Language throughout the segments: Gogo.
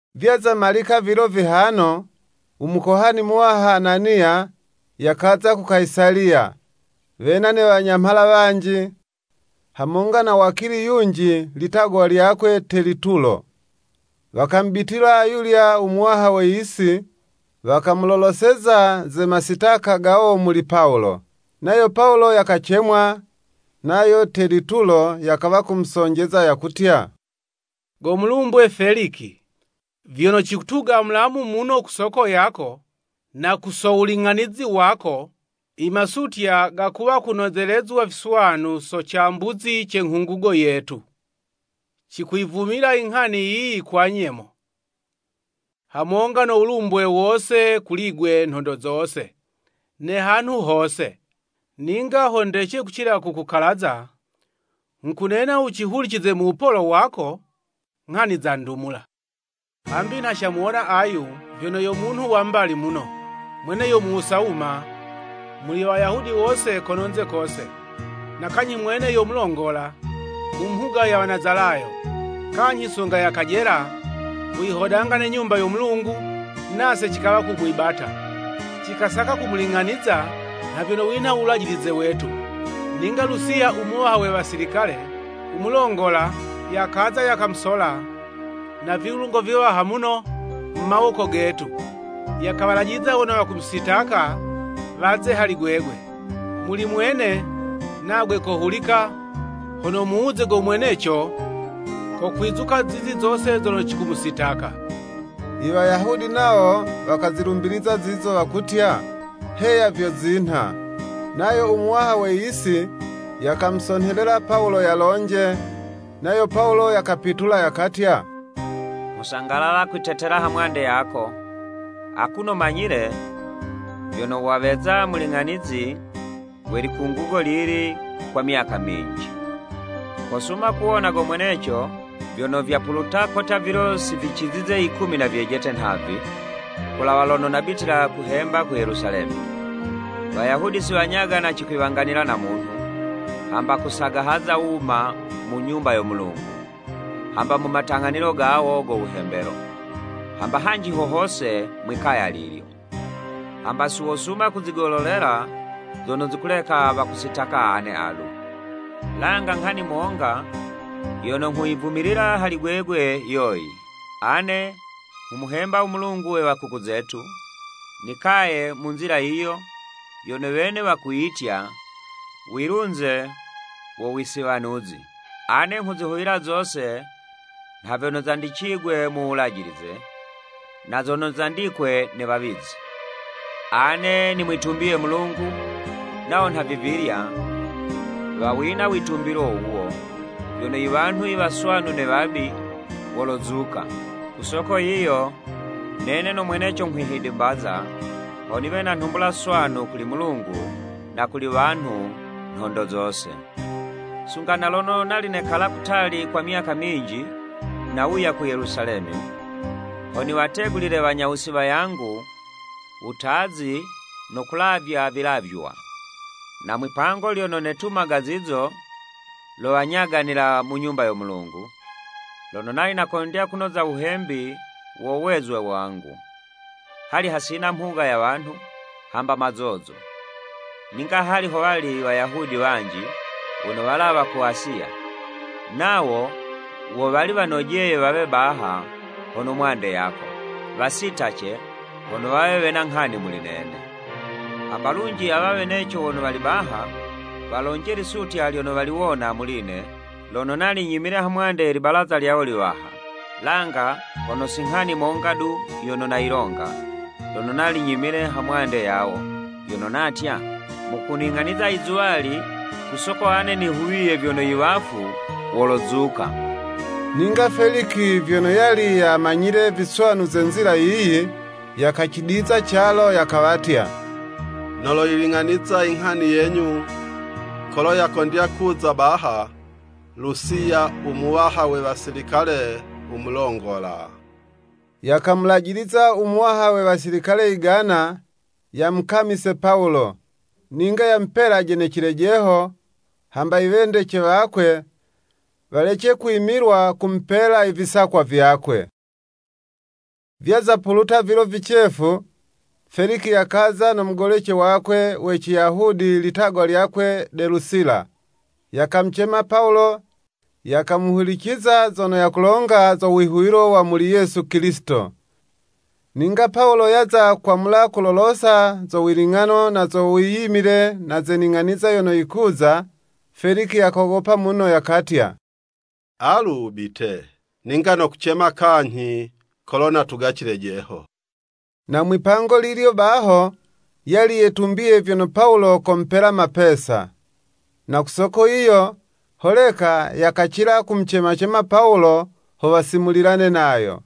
Vyaza malika vilo vihano, Umukohani Muwaha Ananiya, yakaza ku Kayisaliya, wena ne wanyamhala wanji, hamonga na wakili yunji litagwa lyakwe Telitulo. Wakamubitila ayulya u muwaha we yisi, wakamuloloseza ze masitaka gawo muli Pawulo. Nayo Pawulo yakacemwa, nayo Telutiyo yakawa kumusonjeza yakutya, “Go mulumbwe Feliki, vyono cikutuga mulamu muno ku soko yako, na ku so wuling'anizi wako, imasutya gakuwa kunozelezwa viswanu so cambuzi ce nghungugo yetu. Cikuyivumila inghani yiyi kwa nyemo, hamonga no wulumbwe wose kuli'gwe nhondo zose ne hanhu hose. Ninga ho ndece kucila kukukalaza, nghukunena wucihulicize mu wupolo wako, nghani za ndumula. Hambi nha camuwona ayu vyono yo munhu wa mbali muno, mwene yo muwusa wuma muli Wayahudi wose kononze kose, na kanyhi mwene yo mulongola mu mhuga ye Wanazalayo. Kanyhi sunga yakajela kuyihodanga ne Nyumba yo Mulungu, nase cikawa kumwibata. [Cikasaka kumuling'aniza nha vyono winho wulajilize wetu, ninga Lusiya u muwaha we wasilikale u mulongola, yakaza, yakamusola na vilungo viwaha muno mu mawoko getu. Yakawalajiliza wono wakumusitaka, waze hali gwegwe.] Muli mwene, nagwe kohulika, hono wumuwuze go mweneco, kokwizuka zizo zose zono cikumusitaka.” Iwayahudi nawo wakazilumbiliza zizo wakutya, “Heya vyo zinha.” Nayo u muwaha we yisi, yakamusonhelela Pawulo yalonje, nayo Pawulo yakapitula yakatya, “Nghusangalala kwitetela hamwande yako, akuno manyile vyono waweza muling'anizi we likungugo lili kwa myaka minji. Kosuma kuwona go mweneco, vyono vyapuluta kotya vilo si vicizize yikumi na vyejete nhavi, kulawa lono nabitila kuhemba ku Yelusalemi. Wayahudi si wanyagana cikwiwanganila na munhu, hamba kusagahaza wuma mu Nyumba yo Mulungu, hamba mu matang'anilo gawo go wuhembelo, hamba hanji ho hose mwi'kaya lilyo. Hamba si wosuma kuzigololela zono zikuleka wakusitaka ane alu. Langa nghani monga yono nghuyivumilila hali gwegwe yoyi; Ane nghumuhemba u Mulungu we wakuku zetu, nikaye mu Nzila yiyo yono wene wakuyitya, wilunze wo wisiwanuzi. Ane nghuzihuwila zose nha vyono zandicigwe mu Wulajilize, na zono zandikwe ne wawizi. Ane nimwitumbiye Mulungu, nawo nhavivilya, wawina witumbilo wuwo, vyono iwanhu iwaswanu ne wabi, wolozuka. Ku soko yiyo, nene no mweneco, nghwihidimbaza, ho niwe na nhumbula swanu kuli Mulungu, na kuli wanhu, nhondo zose. “Sunga na lono nali nekala kutali kwa myaka minji, nawuya ku Yelusalemi, ho niwategulile wanyawusi wayangu wutazi no kulavya vilavywa. Na mwipango lyono netumaga zizo, lo wanyaganila mu Nyumba yo Mulungu, lono nali nakondya kunoza wuhembi wo wezwe wangu. Hali hasina mhuga ya wanhu, hamba mazozo. Ninga hali ho wali Wayahudi wanji, wono walawa ku Asiya, nawo wo wali wanojeye wawe baha hono mwande yako, wasitace, hono wawe wena nghani muli nene. Hamba, lunji awa weneco wono wali baha, walonje lisutya lyono waliwona muli'ne, lono nali nyimile hamwande ye libalaza lyawo liwaha. Langa hono si nghani monga du yono nayilonga, lono nali nyimile ha mwande yawo, yono natya, ‘Mukuning'aniza izuwali ku soko ane nihuwiye vyono iwafu wolozuka.’” Ninga Feliki, vyono yali yamanyile viswanu ze Nzila yiyi, yakacidiza calo, yakawatya “Noloyiling'aniza yinghani yenyu kolo yakondya kuza baha Lusiya umuwaha we wasilikale umulongola.” Yakamulajiliza umuwaha we wasilikale igana, yamukamise Pawulo, ninga yamupelaje ne cilejeho, hamba iwendece wakwe, walece kwimilwa kumupela ivisakwa vyakwe. Vyaza puluta vilo vicefu, Feliki yakaza no mugolece wakwe we Ciyahudi ilitagwa lyakwe Delusila. Yakamucema Pawulo, yakamuhuliciza zono yakulonga zo wihuwilo wa muli Yesu Kilisito. Ninga Pawulo yaza kwamula kulolosa zo wiling'ano na zo wiyimile na ze ning'aniza yono yikuza, Feliki yakogopa muno yakatya, “Alu wubite, ninga nokucema kanyhi kolo natuga cilejeho.” Na mwi'pango lilyo baho, yali yetumbiye vyono Pawulo komupela mapesa. Na ku soko yiyo, holeka yakacila kumucema-cema Pawulo ho wasimulilane nayo.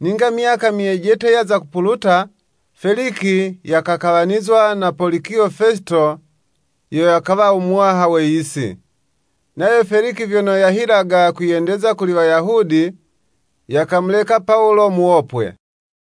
Ninga myaka myejete yaza kupuluta, Feliki yakakawanizwa na Polikiyo Fesito yo yakawa u muwaha we yisi. Nayo Feliki vyono yahilaga kwiyendeza kuli Wayahudi, yakamuleka Pawulo muwopwe.